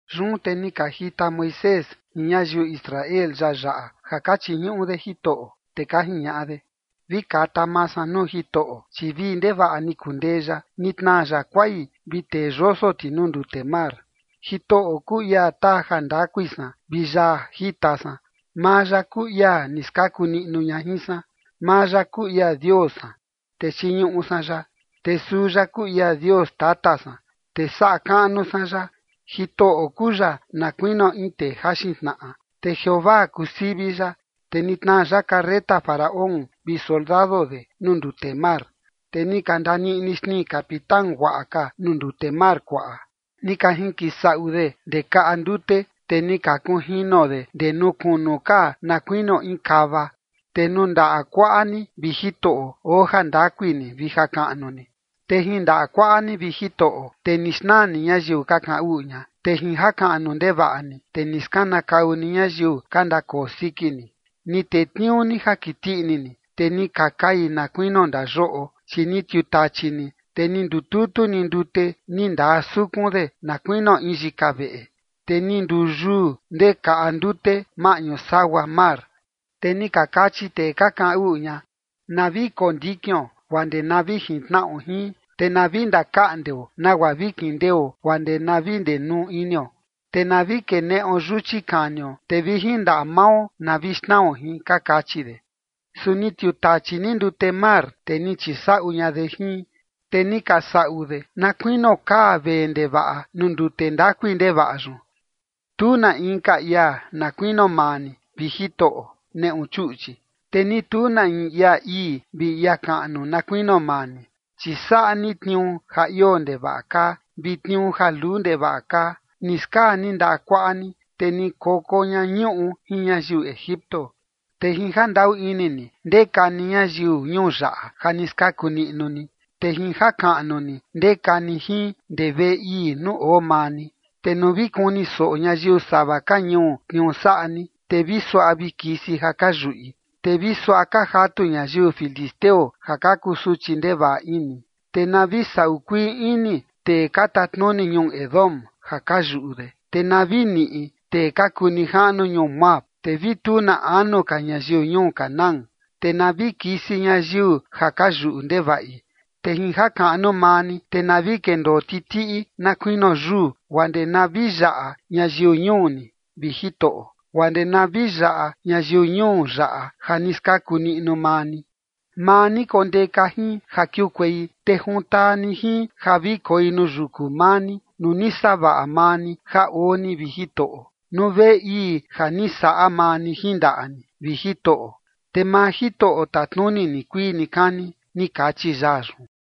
Yun te ni ka jita Moisés jin ñayiu Israel yaa yaꞌa ja ka chiñuꞌu de Jitoꞌo, te ka jiñaꞌa de: Vi kata maa san nuu Jitoꞌo, chi vii ndevaꞌa ni kundee ya. Ni tnaa ya kuai vi tee yoso ti nuu ndute mar. Jitoꞌo kuu ia taa jandakui san vi yaa jita san. Maa ya kuu ia ni skaku niꞌnu ña jin san. Maa ya kuu ia Dios san, te chiñuꞌu san ya. Te suu ya kuu ia Dios tata san, te saꞌa kaꞌnu san ya. Jitoꞌo kuu ya na kuinio in tee jaxin tnaꞌa Te Jeovaa kuu sivi ya. Te ni tnaa ya carreta Faraón vi soldado de nuu ndute mar. Te ni ka ndaniꞌni xnii capitán guaꞌa ka nuu ndute mar kuaꞌa. Ni ka jinkisaꞌu de ndee kaꞌa ndute, te ni ka kunjino de ndee nuu kunu ka na kuinio in kava. Te nuu ndaꞌa kuaꞌa ni, vi Jitoꞌo, oo jandakui ni vi jakaꞌnu ni. Te jin ndaꞌa kuaꞌa ni, vi Jitoꞌo, te ni xnaa ni ñayiu ka kaꞌan uꞌu ña. Te jin jakaꞌnu ndevaꞌa ni, te ni skanakau ni ñayiu ka ndakoo siki ni. Ni tetniuu ni ja kiti ini ni, te ni ka kai na kuinio ndayoꞌo. Chi ni tiutachi ni, te ni ndututu ni ndute ni ndaa sukun de na kuinio in yika veꞌe. Te ni nduu yuu ndee kaꞌa ndute maꞌñu sagua mar. Te ni ka kachi tee ka kaꞌan uꞌu ña: “Na vi kondikion guaa ndee na vi jintnaꞌo jin, te na vi ndakaꞌndeo nagua vi kindeo guaa ndee na vi ndenuu inio. Te na vi keneꞌo yuchi kanio, te vi jin ndaꞌa mao na vi xnao jin” ka kachi de. Su ni tiutachi ni ndute mar, te ni chisaꞌu ña de jin. Te ni ka saꞌu de na kuinio kaa vee ndevaꞌa nuu ndute ndakui ndevaꞌa yun. Tu na inka ia na kuinio maa ni, vi Jitoꞌo, neꞌu chuꞌchi. Te ni tu na in ia ii vi ia kaꞌnu na kuinio maa ni. Chi saꞌa ni tniuu ja ioo ndevaꞌa kaa, vi tniuu ja luu ndevaꞌa kaa. Ni skaa ni ndaꞌa kuaꞌa ni, te ni koko ña ñuꞌu jin ñayiu Egipto. Te jin jandaꞌu ini ni ndeka ni ñayiu ñuu yaꞌa ja ni skaku niꞌnu ni. Te jin jakaꞌnu ni ndeka ni jin ndee veꞌe ii nuu oo maa ni. Te nuu vi kuni soꞌo ñayiu sava ka ñuu tniuu saꞌa ni, te vi suaꞌa vi kisi ja ka yuꞌi. Te vi suaꞌa ka jatu ñayiu filisteo ja ka kusuchi ndevaꞌa ini. Te na vi saꞌu kuii ini tee ka tatnuni ñuu Edom ja ka yuꞌu de. Te na vi niꞌi tee ka kuu nijaꞌnu ñuu Moab. Te vi tu na anu ka ñayiu ñuu Canaán. Te na vi kisi ñayiu ja ka yuꞌu ndevaꞌi. Te jin jakaꞌnu maa ni, te na vi kendoo titiꞌi na kuinio yuu, guaa ndee na vi yaꞌa ñayiu ñuu ni, vi Jitoꞌo, guaa ndee na vi yaꞌa ñayiu ñuu yaꞌa ja ni skaku niꞌnu maa ni. Maa ni kondeka jin ja kiukuei, te juntaa ni jin ja vi koi nuu yuku maa ni, nuu ni savaꞌa maa ni ja oo ni, vi Jitoꞌo, nuu veꞌe ii ja ni saꞌa maa ni jin ndaꞌa ni, vi Jitoꞌo. Te maa Jitoꞌo tatnuni nikuii nikani, ni kachi yaa yun.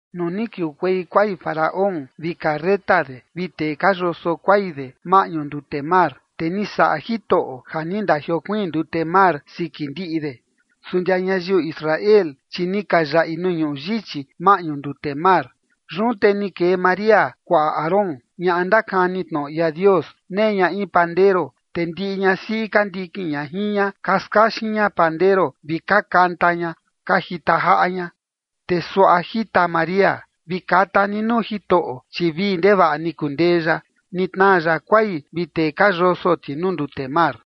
Nuu ni kiukuei kuai Faraón vi carreta de vi tee ka yoso kuai de maꞌñu ndute mar, te ni saꞌa Jitoꞌo ja ni ndajiokuiin ndute mar siki ndiꞌi de. Su ndia ñayiu Israel, chi ni ka yaꞌi nuu ñuꞌu yichi maꞌñu ndute mar. Yun te ni kee María, kuaꞌa Aarón, ñaꞌa ndakani tnoꞌo ia Dios. Nee ña in pandero, te ndiꞌi ñasiꞌi ka ndikin ña jin ña ka skaxin ña pandero vi ka kanta ña ka jita jaꞌa ña. Te suaꞌa jita María: Vi kata ni nuu Jitoꞌo, chi vii ndevaꞌa ni kundee ya. Ni tnaa ya kuai vi tee ka yoso ti nuu ndute mar.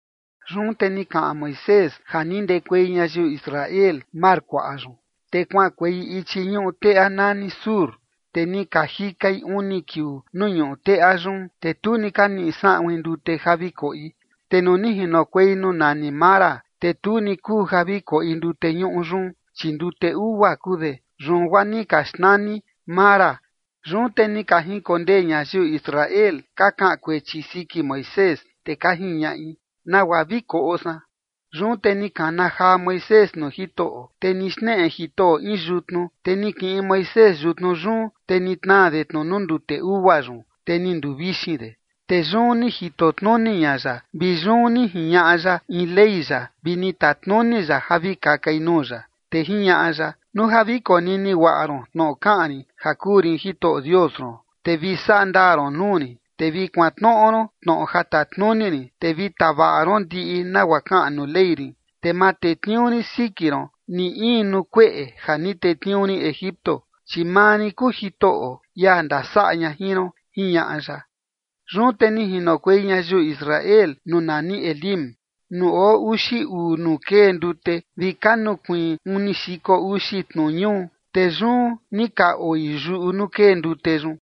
Yun te ni kaꞌan Moisés ja ni ndekuei ñayiu Israel mar kuaꞌa yun, te kuaꞌankuei ichi ñuꞌu teꞌa nani Shur. Te ni ka jikai uni kiuu nuu ñuꞌu teꞌa yun, te tu ni ka niꞌi saꞌuin ndute ja vi koꞌi. Te nuu ni jinokuei nuu nani Mara, te tu ni kuu ja vi koꞌi ndute ñuꞌu yun, chi ndute ugua kuu de. Yun guaa ni ka xnani Mara. Yun te ni ka jinkondee ñayiu Israel ka kaꞌan kuechi siki Moisés, te ka jiñaꞌi: ―¿Nagua vi koꞌo san? Yun te ni kana jaa Moisés nuu Jitoꞌo, te ni xneꞌe Jitoꞌo in yutnu, te ni kiꞌin Moisés yutnu yun, te ni tnaa de tnu nuu ndute ugua yun, te ni nduu vixin de. Te yun ni jito tnuni ña ya, vi yun ni jiñaꞌa ya in ley ya vi ni tatnuni ya ja vi kakai nuu ya. Te jiñaꞌa ya: ―Nuu ja vi konini guaꞌa ron tnoꞌo kaꞌan rin ja kuu rin Jitoꞌo Dios ron, te vi saꞌa ndaa ron nuu rin, te vi kuantnoꞌo ron tnoꞌo ja tatnuni rin, te vi tavaꞌa ron ndiꞌi nagua kaꞌan nuu ley rin, te ma tetniuu rin siki ron ni in nuu kueꞌe ja ni tetniuu rin Egipto, chi maa rin kuu Jitoꞌo, ia ndasaꞌa ña jin ron ―jiñaꞌa ya. Yun te ni jinokuei ñayiu Israel nuu nani Elim, nuu oo uxi uu nuu kee ndute vi ka nukuiin uni xiko uxi tnu ñuu. Te yun ni ka oi yuꞌu nuu kee ndute yun.